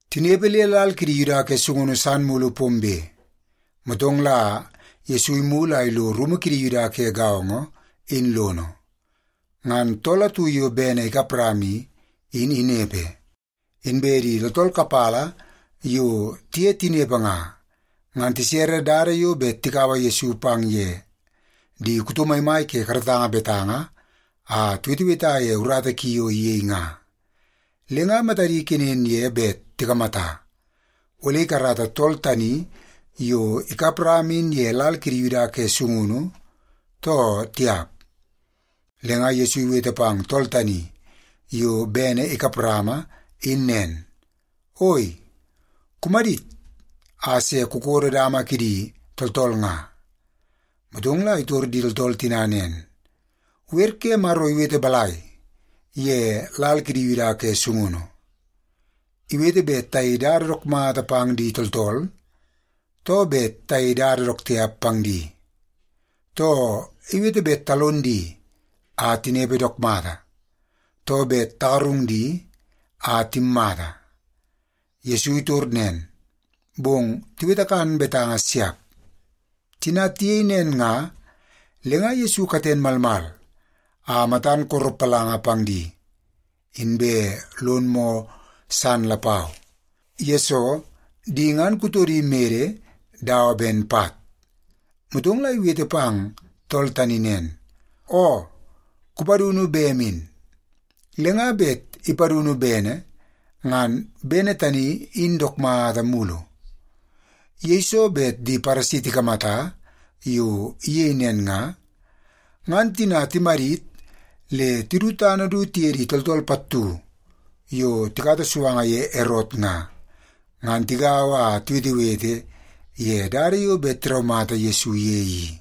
Tinepe le lal kidi Yuda ke sungunu san mulu pombe, motong la Yesu imulu a ilo rumu kidi Yuda ke gaongo in lono, ngan tool atu yo bene ikap rama i, in inepe. Inbe di tooltool kapala yo tiye tinepe nga, ngan tisere dada yo bet tikaua Yesu pang ye di kuto maimai ke karatanga betanga a tiweteweta ye urata ki yo iyei nga. Le nga matadi kenen ye bet tikamata, ole ikarata tool tani yo ikap rama in ye lal kidi Yuda ke sungunu, too tiap. Le nga Yesu iwete pang tool tani yo bene ikap rama in nen, “Oi, kumadit a se kukodo dama kidi tooltool nga.” Motong la itor di tooltool tina nen, “Wer ke Maro iwete balai ye lal kidi Yuda ke sungunu? Iwete bet tayei dada dook mata pang di tooltool, too bet tayei dada dook tiap pang di? Too, iwete bet talon di a tinepe dook mata, too bet tagarung di a timmata?” Yesu itor nen, bong tiwete kan betanga siap. Tina tiyei nen nga, le nga Yesu katen malmal a matan koropalanga pang di. Inbe lon moo san lapau, yesoo di ngan kutodi mede dawa ben pat. Motong la iwete pang tool tani nen, “Oo, kupadunu bem in.” Le nga bet ipadunu bene, ngan bene tani in dook mata mulu. Yeiso bet di Paresi tikamata yo iyei nen nga, ngan tina timadit le tidu tana du tiye di tooltool pattu yo tikata suanga ye Erot nga, ngan tigaua a tiwetewete ye dada yo bet tiraumata Yesu ye i.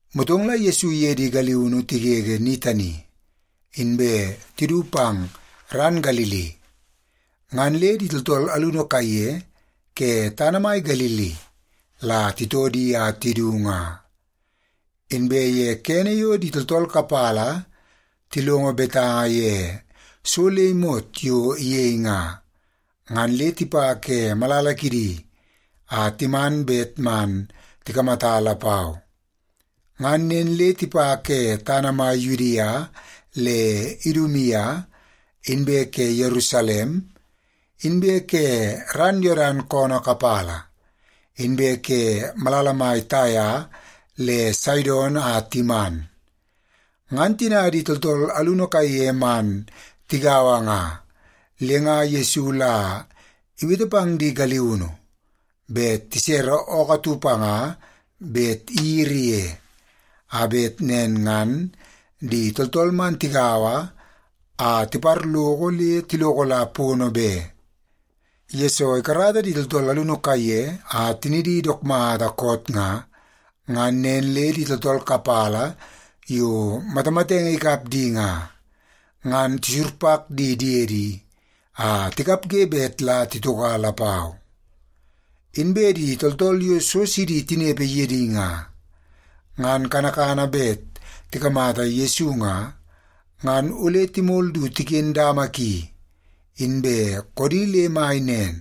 Motong la Yesu iye di galiunu tigege ni tani, inbe tidu pang ran Galili, ngan le di tooltool alunu kaiye ke tana mai Galili la titoo di a tidu nga. Inbe ye kene yo di tooltool kapala tilongo betanga ye so le imot yo iyei nga, ngan le tipa ke malala kidi a timan bet man tikamata lapau. Ngan nen le tipa ke tana mai Yudia le Idumia, inbe ke Yerusalem, inbe ke ran Yodan koonoo kapala, inbe ke malala mai Taia le Saidon a timan. Ngan tina di tooltool alunu kaiye man tigaua nga, le nga Yesu la iwete pang di galiunu bet tisere ookoo atu panga bet iyiri ye, a bet nen ngan di tooltool man tigaua a tiparloko le tiloko la pono be. Yesoo ikarata di tooltool alunu kaiye a tinidi dook mata koot nga, ngan nen le di tooltool kapala yo matamatenge ikap di nga, ngan tisurpak di diedi a tikapge bet la titoka lapau. Inbe di tooltool yo so sidi tinepe ye di nga, ngan kanakana bet tikamata Yesu nga, ngan ole timol du tiken dama ki inbe koodi le mai nen,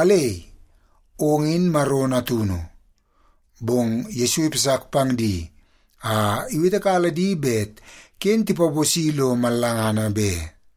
“Alei, ong in Maro Natunu.” Bong Yesu ipasak pang di a iwetekala di bet ken tipaposi lo mallangana be.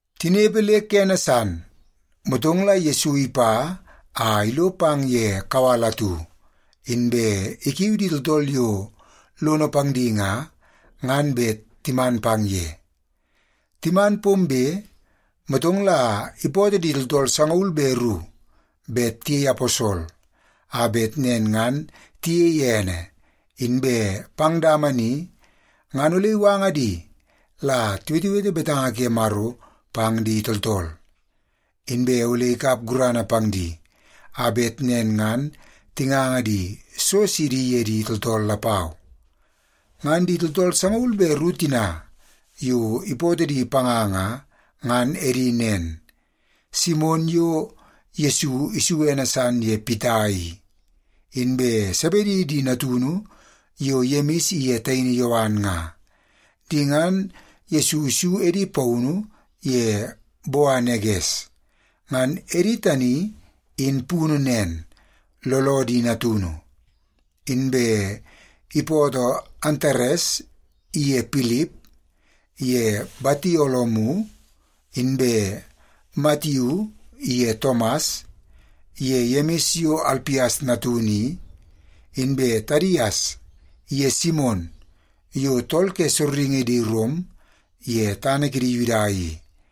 Tinepe le kene san, motong la Yesu ipa a ilo pang ye kawal atu, inbe ikiu di tooltool yo lono pang di nga, ngan bet timan pang ye. Timan pombe, motong la ipootoo di tooltool sangaul be ru bet tiyei aposol, a bet nen ngan tiyei ene, inbe pang dama ni ngan ole iwanga di la tiwetewete betanga ke Maro pang di tooltool. Inbe ole ikap gurana pang di, a bet nen ngan tinganga di so sidi ye di tooltool lapau. Ngan di tooltool sangaul be ru tina yo ipootoo di panga nga, ngan edi nen: Simon yo Yesu isu ene san ye Pita i, inbe Sebedi di natunu yo Yemis iye taini Yowan nga. Di ngan Yesu isu edi paunu ye Boaneges. Ngan edi tani in punu nen, Looloo di Natunu. Inbe ipootoo Antares iye Pilip, ye Batolomiu, inbe Matiu iye Tomas, ye Yemis yo Alpias natunu i, inbe Tadias iye Simon yo tool ke sorringi di Rom ye tana kidi Yuda i,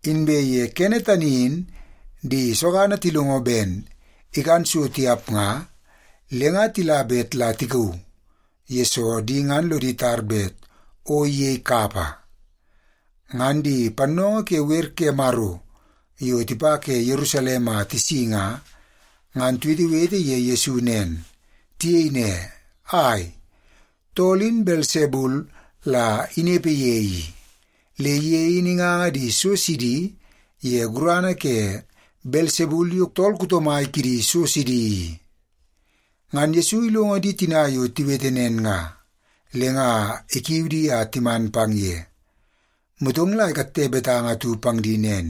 Inbe ye kene tani in di sogana tilongo ben ikan so tiap nga, le nga tila bet la tikauu, yesoo di ngan lodi tar bet o iyei kapa. Ngan di pannoongoo ke wer ke Maro yo tipa ke Yerusalem a tisi nga, ngan tiwetewete ye Yesu nen. Tiyei ne, “Ai, tool in Belsebul la inepe ye i. Le ye in inganga di so sidi ye gurana ke Belsebul yo tool kuto mai kidi so sidi i.” Ngan Yesu ilongo di tina yo tiwete nen nga, le nga ikiu di a timan pang ye, motong la ikatte betanga atu pang di nen,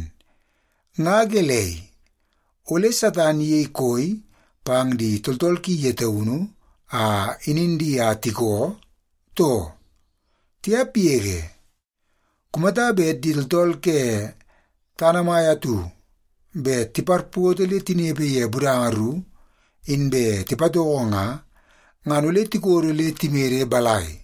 “Nga gelei, ole Satan iyei koi pang di tooltool ki ye taunu a inin di a tikoo, too? Tiap yege! Kumata bet di tooltool ke tana mai atu bet tiparpoto le tinepe ye budanga ru, inbe tipatoko nga, ngan ole tikodo le timede balai?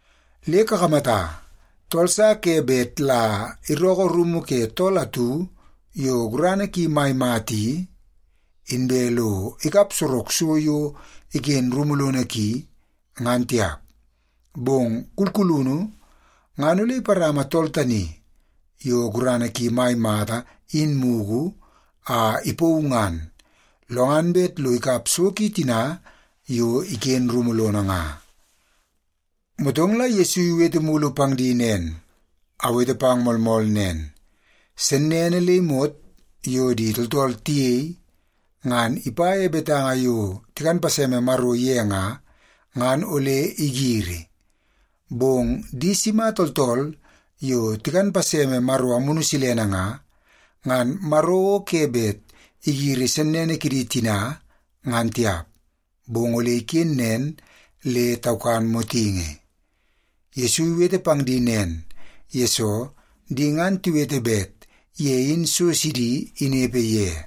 Le kakamata, tool sa ke bet la irookoo rumu ke tool atu yo gurana ki mai mata i, inbe lo ikap sorok so yo iken rumu lono ki, ngan tiap. Bong kulkulunu ngan ole iparama tool tani yo gurana ki mai mata in mugu a ipauu ngan, lo ngan bet lo ikap so ki tina yo iken rumu lono nga.” Motong la Yesu iwete mulu pang di nen, “Awete pang moolmool nen, sennene le imot yo di tooltool tiyei, ngan ipa ye betanga yo tikan paseme Maro ye nga, ngan ole igiri. Bong di sima tooltool yo tikan paseme Maro Amunu Silene nga, ngan Maro o ke bet igiri sennene kidi tina ngan tiap, bong ole iken nen le taukan motingi.” Yesu iwete pang di nen, yesoo di ngan tiwete bet ye in so sidi inepe ye.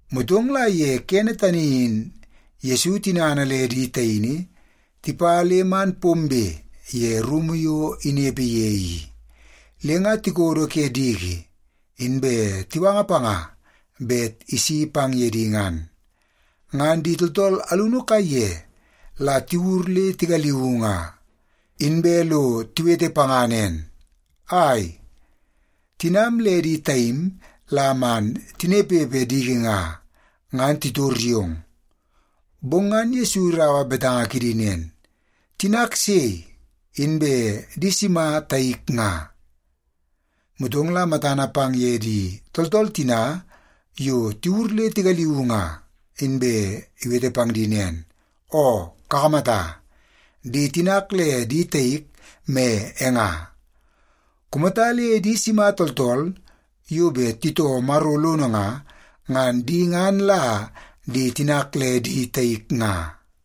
Motong la ye kene tani in Yesu tinana le di taini tipa le man pombe ye rumu yo inepe ye i, le nga tikodo ke diki inbe tiwanga panga bet isi pang ye di ngan. Ngan di tooltool alunu kaiye la tiwur le tigaliuu nga, inbe lo tiwete panga nen, “Ai, tinam le di taim la man tinepepe diki nga, ngan titor yong.” Bong ngan Yesu iraua betanga kidi nen, “Tinak sei, inbe di sima taik nga?” Motong la matana pang ye di tooltool tina yo tiwur le tigaliuu nga, inbe iwete pang di nen, “Oo, kakamata, di tinak le di taik me e nga. Kumata le di sima tooltool yo bet titoo Maro lono nga, ngan di ngan la di tinak le di taik nga.”